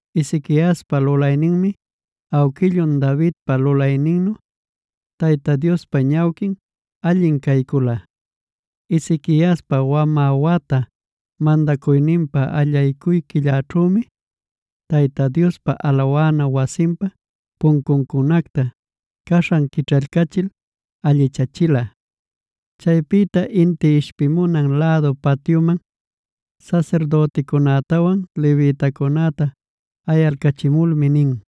Ezequiaspa lulayninmi awquillun Davidpa lulayninnu Tayta Diospa ñawquin allin caycula. Ezequiaspa wamä wata mandacuyninpa allaycuy quillanćhümi, Tayta Diospa alawana wasinpa puncuncunacta caśhan quićhaycachil allichachila. Chaypïta inti ishpimunan lädu patyuman sasirdüticunätawan levitacunäta ayalcachimulmi nin: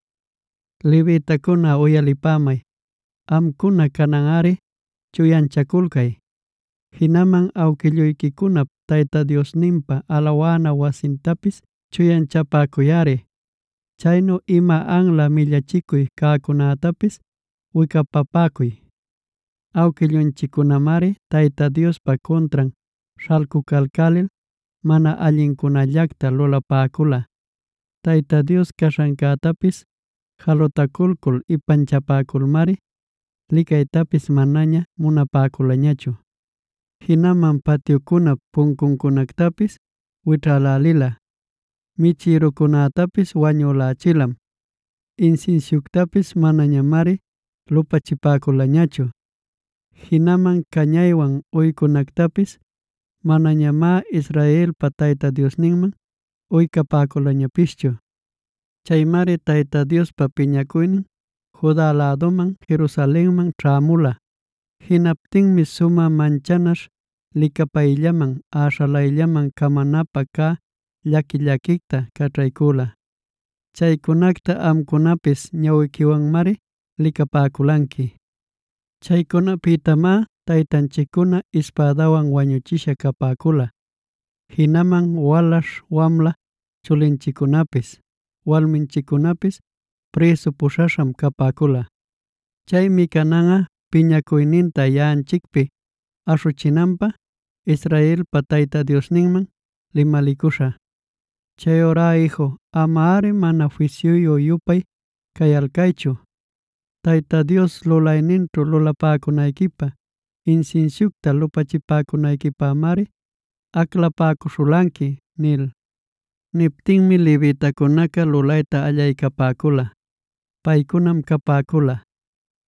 “Levitacuna uyalipämay, amcuna cananꞌari chuyanchaculcay. Jinaman awquilluyquicunap Tayta Diosninpa alawana wasintapis chuyanchapäcuyꞌari. Chayćhu ima anla millachicuy cäcunätapis wicapapäcuy. Awquillunchiccunamari Tayta Diospa cuntran śhalcucalcälil mana allincunallacta lulapäcula. Tayta Dios caśhancätapis jalutaculcul ipanchalculmari, licaytapis manaña munapäculañachu. Jinaman patyucunap puncuncunactapis wićhälälila, michïrucunätapis wañülächilam; insinsiuctapis manañamari lupachipäculañachu. Jinaman cañaywan uycunactapis manañamá Israelpa Tayta Diosninman uycapäculañapischu. Chaymari Tayta Diospa piñacuynin Juda läduman Jerusalenman ćhämula. Jinaptinmi sumä manchäśha licapayllaman, äśhalayllaman camanapä cä llaqui-llaquicta caćhaycüla. Chaycunacta amcunapis ñawiquiwanmari licapäculanqui. Chaycunapïtamá taytanchiccuna ispädawan wañuchisha capäcula. Jinaman walaśh wamla chulinchiccunapis, walminchiccunapis prïsu puśhaśham capäcula. “Chaymi cananꞌa, piñacuyninta yaꞌanchicpi aśhuchinanpä, Israelpa Tayta Diosninman limalicuśhä. Chayurá iju, amari mana fisyuyu-yupay cayalcaychu. Tayta Dios lulayninćhu lulapäcunayquipä, insinsiucta lupachipäcunayquipämari aclapäcuśhulanqui” nil. Niptinmi levitacunaca lulayta allaycapäcula. Paycunam capäcula: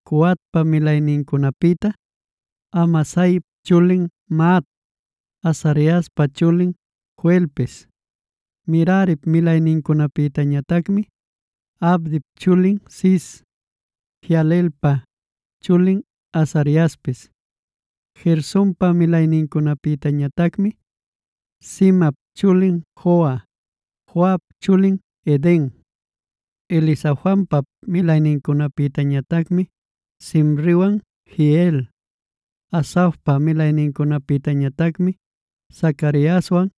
Coatpa milaynincunapïta: Amasaip chulin Mahat, Azariaspa chulin Joelpis. Merarip milaynincunapïtañatacmi: Abdip chulin Cis, Jehalelelpa chulin Azariaspis. Gersonpa milaynincunapïtañatacmi: Zimap chulin Joa, Joap chulin Eden. Elizafanpap milaynincunapïñatacmi: Simriwan Jeiel. Asafpa milaynincunapïñatacmi: Zacariaswan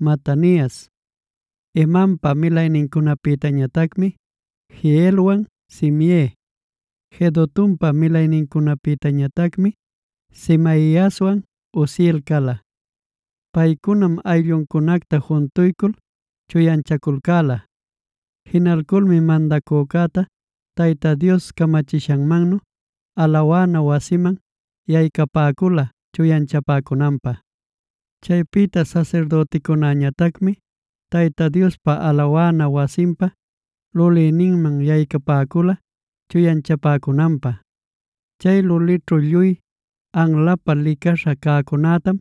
Matanias. Hemanpa milaynincunapïñatacmi: Jehielwan Simei. Jedutunpa milaynincunapïñatacmi: Semaiaswan Uziel cala. Paycunam aylluncunacta juntuycul chuyanchaculcäla. Jinalculmi mandacücäta Tayta Dios camachishanmannu alawana wasiman yaycapäcula chuyanchapäcunanpä. Chaypïta sasirdüticunäñatacmi Tayta Diospa alawana wasinpa lulïninman yaycapäcula chuyanchapäcunanpä. Chay lulićhu lluy anlapä licaśha cäcunätam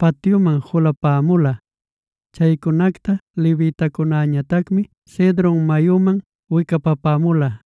patyuman julapämula. Chaycunacta levitacunäñatacmi Cedron mayuman wicapapämula.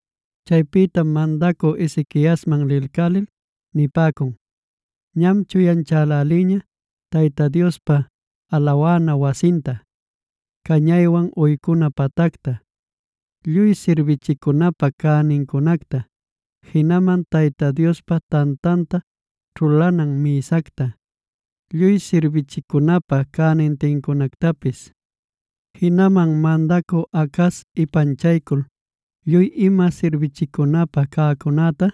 Chaypïtam mandacü Ezequiasman lilcälil nipäcun: “Ñam chuyanchälälïña: Tayta Diospa alawana wasinta, cañaywan uycuna patacta, lluy sirbichicunapa cänincunacta, jinaman Tayta Diospa tantanta ćhulanan mïsacta, lluy sirbichicunapä cänintincunactapis. Jinaman mandacü Acaz ipanchaycul lluy ima sirbichicunapä cäcunäta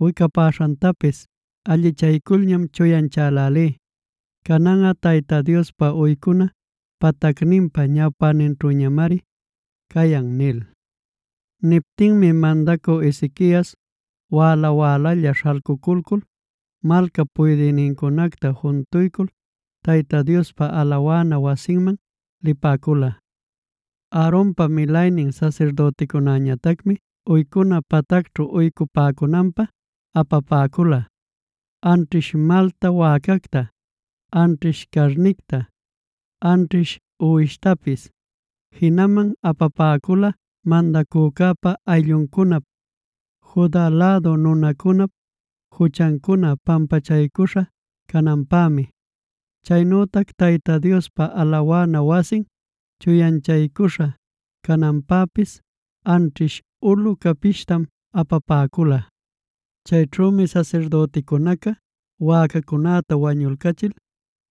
wicapaśhantapis allichayculñam chuyanchälälí. Cananꞌa Tayta Diospa uycuna patacninpa ñawpäninćhüñamari cayan” nil. Niptinmi mandacü Ezequias wäla-wälalla śhalcuculcul malcap puydïnincunacta juntuycul, Tayta Diospa alawana wasinman lipäcula. Aaronpa milaynin sasirdüticunäñatacmi uycuna patacćhu uycupäcunanpä apapäcula: anćhish malta wäcacta, anćhish carnicta, anćhish uwishtapis. Jinaman apapäcula mandacücäpa aylluncunap, Juda lädu nunacunap juchancuna pampachaycuśha cananpämi. Chaynütac Tayta Diospa alawana wasin chuyanchaycuśha cananpäpis anćhish ulu capishtam apapäcula. Chayćhümi sasirdüticunaca wäcacunäta wañulcachil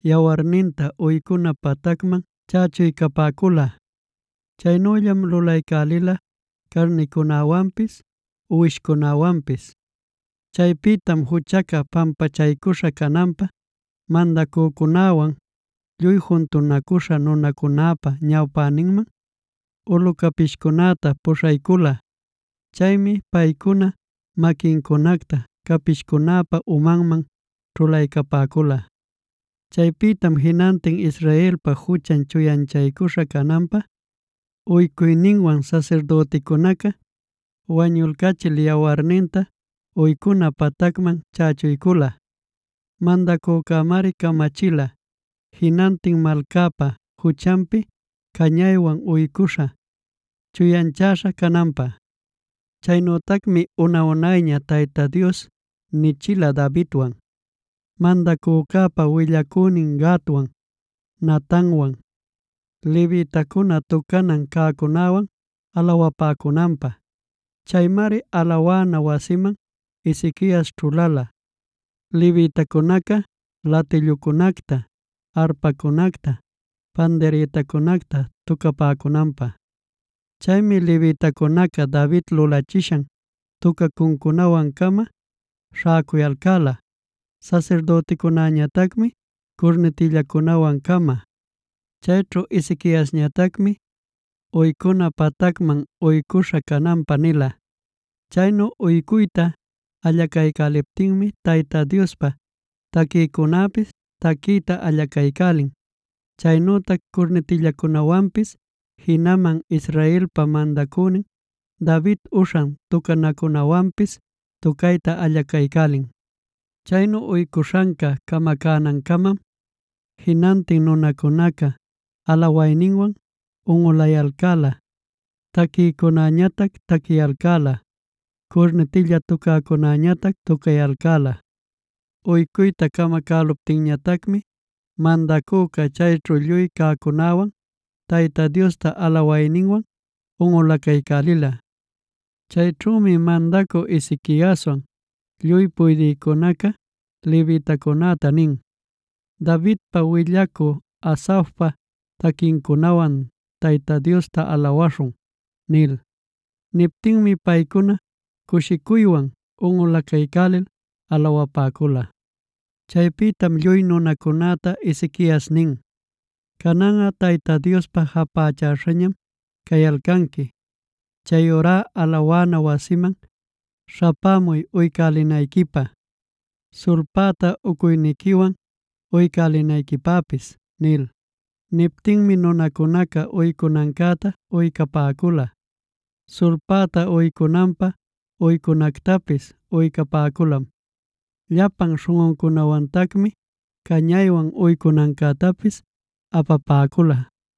yawarninta uycuna patacman chächuycapäcula. Chaynüllam lulaycälila carnicunäwanpis, uwishcunäwanpis. Chaypïtam juchaca pampachaycuśha cananpä mandacücäwan lluy juntunacüśha nunacunäpa ñawpäninman ulu capishcunätaa puśhaycula. Chaymi paycuna maquincunacta capishcunäpa umanman ćhulaycapäcula. Chaypïtam jinantin Israelpa juchan chuyanchaycuśha cananpä uycuyninwan sasirdüticunaca wañulcachil yawarninta uycuna patacman chächuycula. Mandacücämari camachila jinantin malcäpa juchanpi cañaywan uycuśhä, chuyanchaśhä cananpä. Chaynütacmi una-unayña Tayta Dios nichila Davidwan, mandacücäpa willacünin Gadwan, Natanwan,b levitacuna tucanan cäcunäwan alawapäcunanpä. Chaymari alawana wasiman Ezequias ćhulala, levitacunaca latillucunacta, arpacunacta, pandirïtacunacta tucapäcunanpä. Chaymi levitacunaca David lulachishan tucacuncunawan-cama śhäcuyalcäla, sasirdüticunäñatacmi curnitillacunäwan-cama. Chayćhu Ezequiasñatacmi uycuna patacman uycuśha cananpä nila. Chaynu uycuyta allacuycuptinmi Tayta Diospä taquïcunäpis taquiyta allacaycälin. Chaynütac curnitillacunawanpis jinaman Israelpa mandacünin David uśhan tucanacunawanpis tucayta allacaycälin. Chaynu uycuśhanca camacänancamam jinantin nunacunaca alawayninwan unꞌulayalcäla, taquïcunäñatac taquiyalcäla, curnitilla tucäcunäñatac tucayalcäla. Uycuyta camacäluptinñatacmi mandacüca chayćhu lluy cäcunäwan Tayta Diosta alawayninwan unꞌulacaycälila. Chayćhümi mandacü Ezequiaswan lluy puydïcunaca levitacunäta nin: “Davidpa, willacü Asafpa taquincunawan Tayta Diosta alawaśhun” nil. Niptinmi paycuna cushicuywan unꞌulacaycälil alawapäcula. Chaypïtam lluy nunacunäta Ezequias nin: “Cananꞌa Tayta Diospa japächäśhañam cayalcanqui. Chayurá alawana wasinman śhapämuy uycälinayquipä, sulpäta uycuyniquiwan uycälinayquipäpis” nil. Niptinmi nunacunaca uycunancäta uycapäcula, sulpäta uycunanpä uycunactapis uycapäculam; llapan śhunꞌucunawantacmi cañaywan uycunancätapis apapäcula.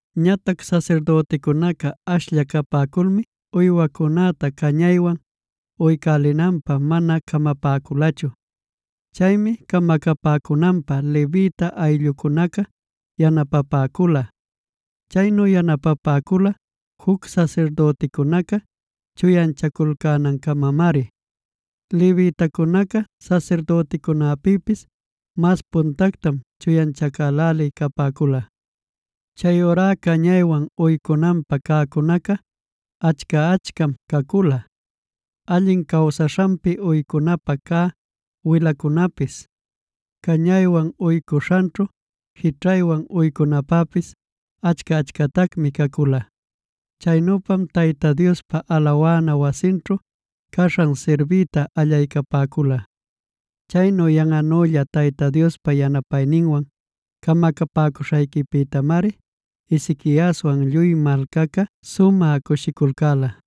Ñatac sasirdüticunaca ashlla capäculmi uywacunäta cañaywan uycälinanpä mana camapäculachu. Chaymi camacapäcunanpä levita ayllucunaca yanapapäcula; chaynu yanapapäcula juc sasirdüticunaca chuyanchaculcänancamamari. Levitacunacá sasirdüticunäpïpis mas puntactam chuyanchacälälí capäcula. Chayurá cañaywan uycunanpä cäcunaca achca-achcam cacula; allin cawsaśhanpi uycunapä cä wilacunapis, cañaywan uycuśhanćhu jićhaywan uycunanpäpis achca-achcatacmi cacula. Chaynüpamá Tayta Diospa alawana wasinćhu caśhan sirbiyta allaycapäcula. Chaynu yanꞌanülla Tayta Diospa yanapayninwan camacapäcuśhanpïtamari Ezequiaswan lluy malcaca sumä cushiculcäla.